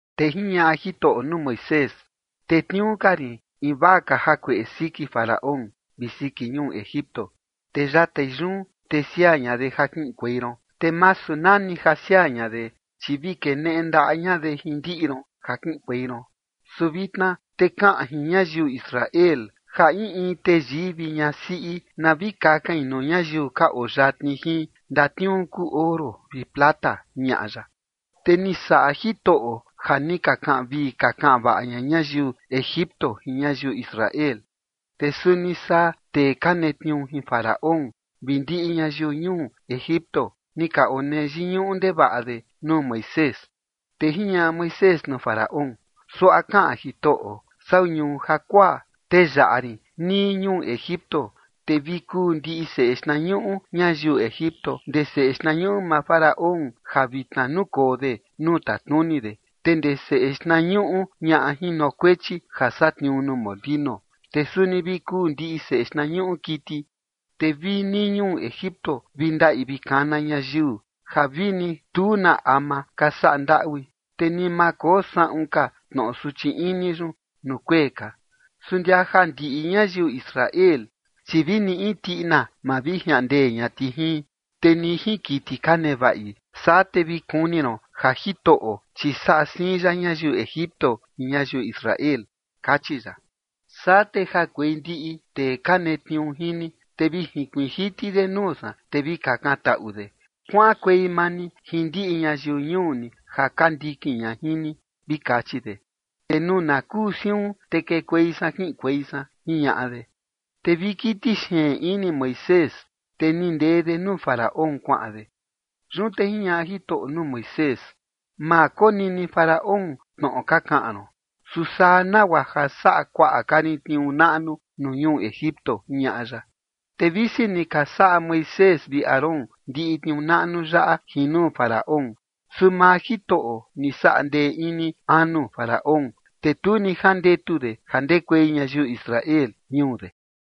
Te jiñaꞌa Jitoꞌo nuu Moisés: ―Tetniuu ka rin invaa ka jakueꞌe siki Faraón vi siki ñuu Egipto. Te yatai yun, te siaa ña de ja kiꞌinkuei ron, te masu nani ja siaa ña de, chi vi keneꞌe ndaꞌa ña de jin ndiꞌi ron ja kiꞌinkuei ron. Su vitna te kaꞌan jin ñayiu Israel ja in in teyii vi ñasiꞌi na vi kakain nuu ñayiu ka oo yatni jin ndatniuu kuu oro vi plata ―jiñaꞌa ya. Te ni saꞌa Jitoꞌo ja ni ka kaꞌan vii ka kaꞌan vaꞌa ña ñayiu Egipto jin ñayiu Israel. Te suni saa tee ka netniuu jin Faraón vi ndiꞌi ñayiu ñuu Egipto ni ka onee yiñuꞌu ndevaꞌa de nuu Moisés. Te jiñaꞌa Moisés nuu Faraón: ―Suaꞌa kaꞌan Jitoꞌo: “Sau ñuu jakuaa, te yaꞌa rin nii ñuu Egipto. Te vi kuu ndiꞌi seꞌe xtnañuꞌu ñayiu Egipto, ndee seꞌe xtnañuꞌu maa Faraón ja vitna nukoo de nuu tatnuni de, te ndee seꞌe xtnañuꞌu ñaꞌa jinokuechi ja satniuu nuu molinu, te suni vi kuu ndiꞌi seꞌe xtnañuꞌu kiti. Te vi nii ñuu Egipto vi ndaꞌi vi kana ñayiu, ja vini tu na ama ka saꞌa ndaꞌui, te ni ma koo saꞌun ka tnoꞌo suchi ini yun nuu kuee ka. Su ndia ja ndiꞌi ñayiu Israel, chi vini in tiꞌina ma vi jiaꞌan ndee ña ti jin, te ni jin kiti ka nevaꞌi. Saa te vi kuni ron ja Jitoꞌo, chi saꞌa siin ya ñayiu Egipto jin ñayiu Israel”, kachi ya. Saa te jakuei ndiꞌi tee ka netniuu jin ni, te vi jinkuiin jiti de nuu san, te vi kakantaꞌu de: “Kuaꞌankuei maa ni jin ndiꞌi ñayiu ñuu ni ja ka ndikin ña jin ni”, vi kachi de. Te nuu na kuu siun, te kekuei san kiꞌinkuei san ―jiñaꞌa de. Te vi kiti xeen ini Moisés, te ni ndee de nuu Faraón kuaꞌan de. Yun te jiñaꞌa Jitoꞌo nuu Moisés: ―Ma konini Faraón tnoꞌo ka kaꞌan ron, su saa nagua ja saꞌa kuaꞌa ka rin tniuu naꞌnu nuu ñuu Egipto ―jiñaꞌa ya. Te visi ni ka saꞌa Moisés vi Aarón ndiꞌi tniuu naꞌnu yaꞌa jin nuu Faraón, su maa Jitoꞌo ni saꞌa ndee ini anu Faraón, te tu ni jandetu de ja ndekuei ñayiu Israel ñuu de.